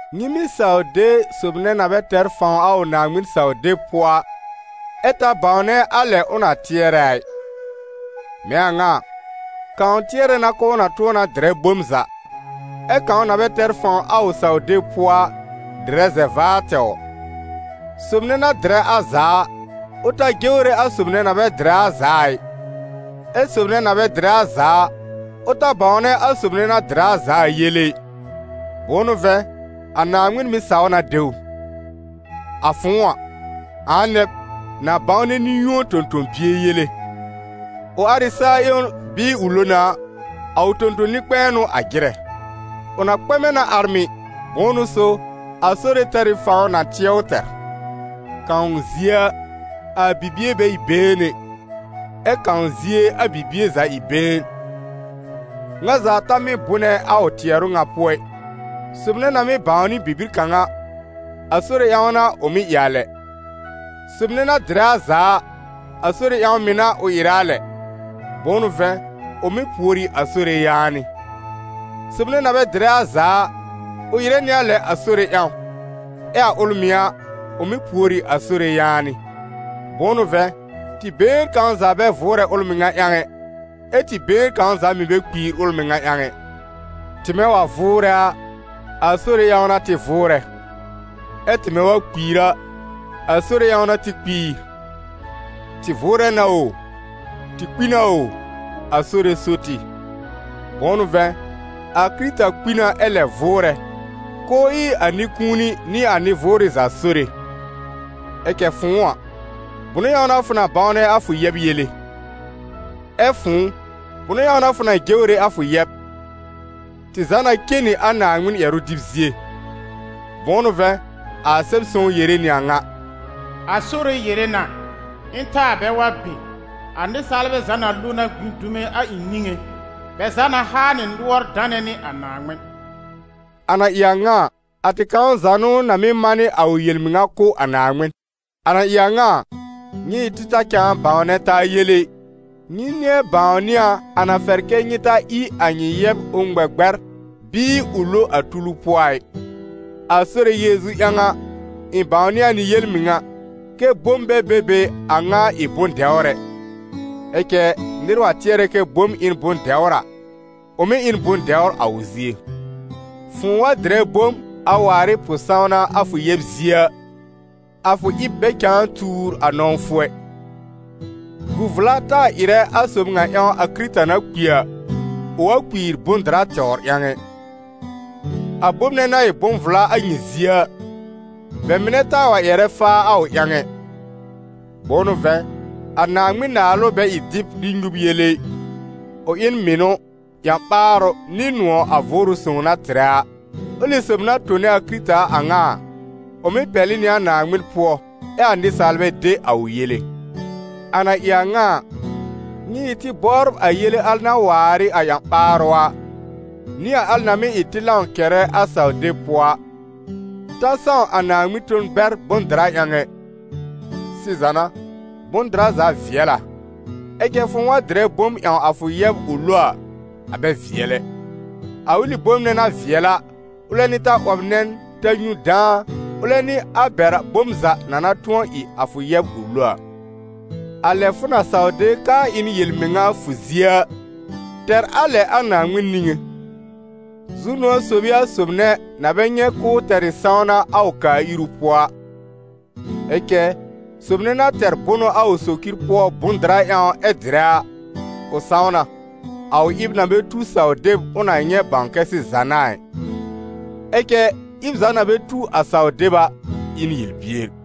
Nyɩ mɩ́ saw de sob nɛ na bɛ tɛr fãw a ʋ Naaŋmɩn-saw-deb pʋɔ a, ɛ ta bãwnɛ a lɛ ʋ na tɩɛrɛ a ɩ. Mɛ̃ a ŋa a, kãw tɩɛrɛ na k'ʋʋ na tʋ̃ɔ na dɩrɛ bom za, ɛ kãw na bɛ tɛr fãw a ʋ saw-deb pʋɔ a, dɩrɛ zɛ-vaar tɛwr. Sob nɛ na dɩrɛ a za a, ʋ ta jewre a sob nɛ na bɛ dɩrɛ a za a ɩ, ɛ sob nɛ na bɛ dɩrɛ a za a, ʋ ta bãwnɛ a sob nɛ na dɩrɛ a za a yele ɩ; bʋ̃ʋ n'ʋ vɛ̃, a Naaŋmɩn mɩ̀ saw na de ʋ. A fʋ̃ʋ a, ãa nɛ b, na bãwnɛ nɩ-yũo tõ-tõ-bie yele? Ʋ ar ɩ saa-ƴewn bɩɩ ʋ lo na a, a ʋ tõ-tõ-nɩ-kpɛ̃ɛ n'ʋ a jɩrɛ. Ʋ na kpɛmɛ na ar mɩ̀, bʋ̃ʋ n'ʋ so, a Sore tɛr ɩ fãw na tɩɛ ʋ tɛr. Kãw zie a, a bibie bɛ ɩ been ɛ, ɛ kãw zie a bibie za ɩ been. Ŋa za ta mɩ́ bʋnɛ a ʋ tɩɛrʋ ŋa pʋɔ ɩ. Sob nɛ na mɩ́ bãwnɩ bibir kãw a, a Sore ƴãw n'a ʋ mɩ́ ɩ a lɛ; sob nɛ na dɩrɛ a za a, a Sore ƴãw mɩ̀ n'a ʋ ɩrɛ a lɛ, bʋ̃ʋ n'ʋ vɛ̃, ʋ mɩ́ pùor ɩ a Sore yaanɩ. Sob nɛ na bɛ dɩrɛ a za a, ʋ ɩrɛ nɩ a lɛ a Sore ƴãw, ɛ a ʋl mɩ̀ a, ʋ mɩ́ pùor ɩ a Sore yaanɩ. Bʋ̃ʋ n'ʋ vɛ̃, tɩ been kãw za bɛ vʋʋrɛ ʋl mɩŋa ƴãw ɛ, ɛ tɩ been kãw za mɩ̀ bɛ kpiir ʋl mɩŋa ƴãw ɛ. Tɩmɛ wa vʋʋrɛ a, a Sore ƴãw n'a tɩ vʋʋrɛ, ɛ tɩmɛ wa kpiir a, a Sore ƴãw n'a tɩ kpiir: tɩ vʋʋrɛ na o, tɩ kpi na o, a Sore so tɩ. Bʋ̃ʋ n'ʋ vɛ̃, a Kɩrɩta kpi na ɛ lɛb vʋʋrɛ, k'ʋʋ ɩ a nɩ-kũuni nɩ a nɩ-vʋʋrɩ za Sore. Ɛ cɛ fʋ̃ʋ a, bʋnʋ ƴãw n'a fʋ bãwnɛ a fʋ yɛb yele? Ɛ fʋ̃ʋ, bʋnʋ ƴãw n'a fʋ jewre a fʋ yɛb? Tɩ za na cen nɩ a Naaŋmɩn ƴɛrʋ dɩb zie. Bʋ̃ʋ n'ʋ vɛ̃, a Sɛb-sõw yere nɩ a ŋa: «A Sore yere na: Ɩ̃ taa bɛ wa be, a nɩsaalbɛ za na lo na gbĩ dume a ɩ̃ niŋé, bɛ za na haa nɩ nʋɔr danɛ nɩ a Naaŋmɩn.» A na ɩ a ŋa a, a tɩ kãw za n'ʋ na mɩ́ manɩ a ʋ yel-mɩŋa kʋ̀ a Naaŋmɩn. A na ɩ a ŋa a, nyɩ ɩ tɩ ta cãa bãwnɛ taa yele ɩ. Nyɩ nɩ̃ɛ bãwnɩ a a na fɛr kɛ́ nyɩ ta ɩ a nyɩ yɛb ʋ ŋmɛ gbɛr bɩɩ ʋ lo a tulu pʋɔ a ɩ. A Sore Yeezu ƴãw a, ɩ̃ bãwnɩ a nɩ yel-mɩŋa, kɛ́ bom bɛ be be a ŋa ɩ bʋ̃-dɛwr ɛ. Ɛ cɛ nɩr wa tɩɛrɛ kɛ bom ɩ n bʋ̃-dɛwr a, ʋ mɩ́ ɩ n bʋ̃-dɛwr a ʋ zie. Fʋ̃ʋ wa dɩrɛ bom, a waar ɩ pʋ-sãwna a fʋ yɛb zie a, a fʋ ɩb bɛ cãa tuur a nɔ̃wfʋ ɛ. Gu vla taa ɩrɛ, a sob ŋa ƴãw a Kɩrɩta na kpi a, ʋ wa kpiir bʋ̃-dɩra tɛwr ƴãw ɛ. A bom nɛ na ɩ bʋ̃-vla a nyɩ zie a, bɛ mɩnɛ taa wa ƴɛrɛ faa a ʋ ƴãw ɛ. Bʋ̃ʋ n'ʋ vɛ̃, a Naaŋmɩn-Naalʋ bɛ ɩ dɩb nɩ nyub yele ɩ, ʋ ɩ n mɩnʋ, ƴã-ɓaarʋ nɩ nʋ̃ɔ̀ a Vʋʋrʋ Sõw na tɩrɛ a. Ʋlɩ sob na tone a Kɩrɩta a ŋa a, ʋ mɩ́ pɛlɩ nɩ a Naaŋmɩn pʋɔ ɛ a nɩsaalbɛ de a ʋ yele. A na ɩ a ŋa a, nyɩ ɩ tɩ bɔbr a yele al na waar ɩ a ƴã-ɓaarʋ a, nɩ a al na mɩ́ ɩ tɩ lãw kɛrɛ a saw-deb pʋɔ a. Ta sãw a Naaŋmɩn ton bɛr bʋ̃-dɩra ƴãw ɛ. Sɩza n'a, bʋ̃-dɩra za vɩɛl a, ɛ cɛ fʋ̃ʋ wa dɩrɛ bom ƴãw a fʋ yɛb ʋ lo a, a bɛ vɩɛl ɛ. A ʋlɩ bom nɛ na vɩɛl a, ʋlɛ n'ɩ ta 'wɔb nɛn, ta nyũ dãa, ʋlɛ n'ɩ a bɛr bom za na na tʋ̃ɔ ɩ a fʋ yɛb ʋ lo a. A lɛ fʋ na saw de k'aa ɩ n yel-mɩŋa a fʋ zie a, tɛr a lɛ a Naaŋmɩn niŋé. Zu-nʋ̃ɔ̀ sob ɩ a sob nɛ na bɛ nyɛ̃ k'ʋʋ tɛr ɩ sãwna a ʋ kaa-iru pʋɔ a! Ɛ cɛ sob nɛ na tɛr bʋnʋ a ʋ socir pʋɔ bʋ̃-dɩra ƴãw ɛ dɩrɛ a, ʋ sãw na, a ʋ ɩb na bɛ tu saw-deb ʋ na nyɛ̃ bãw kɛ sɩza n'a a ɩ. Ɛ cɛ ɩb za na bɛ tu a saw-deb a, ɩ n yel-bier.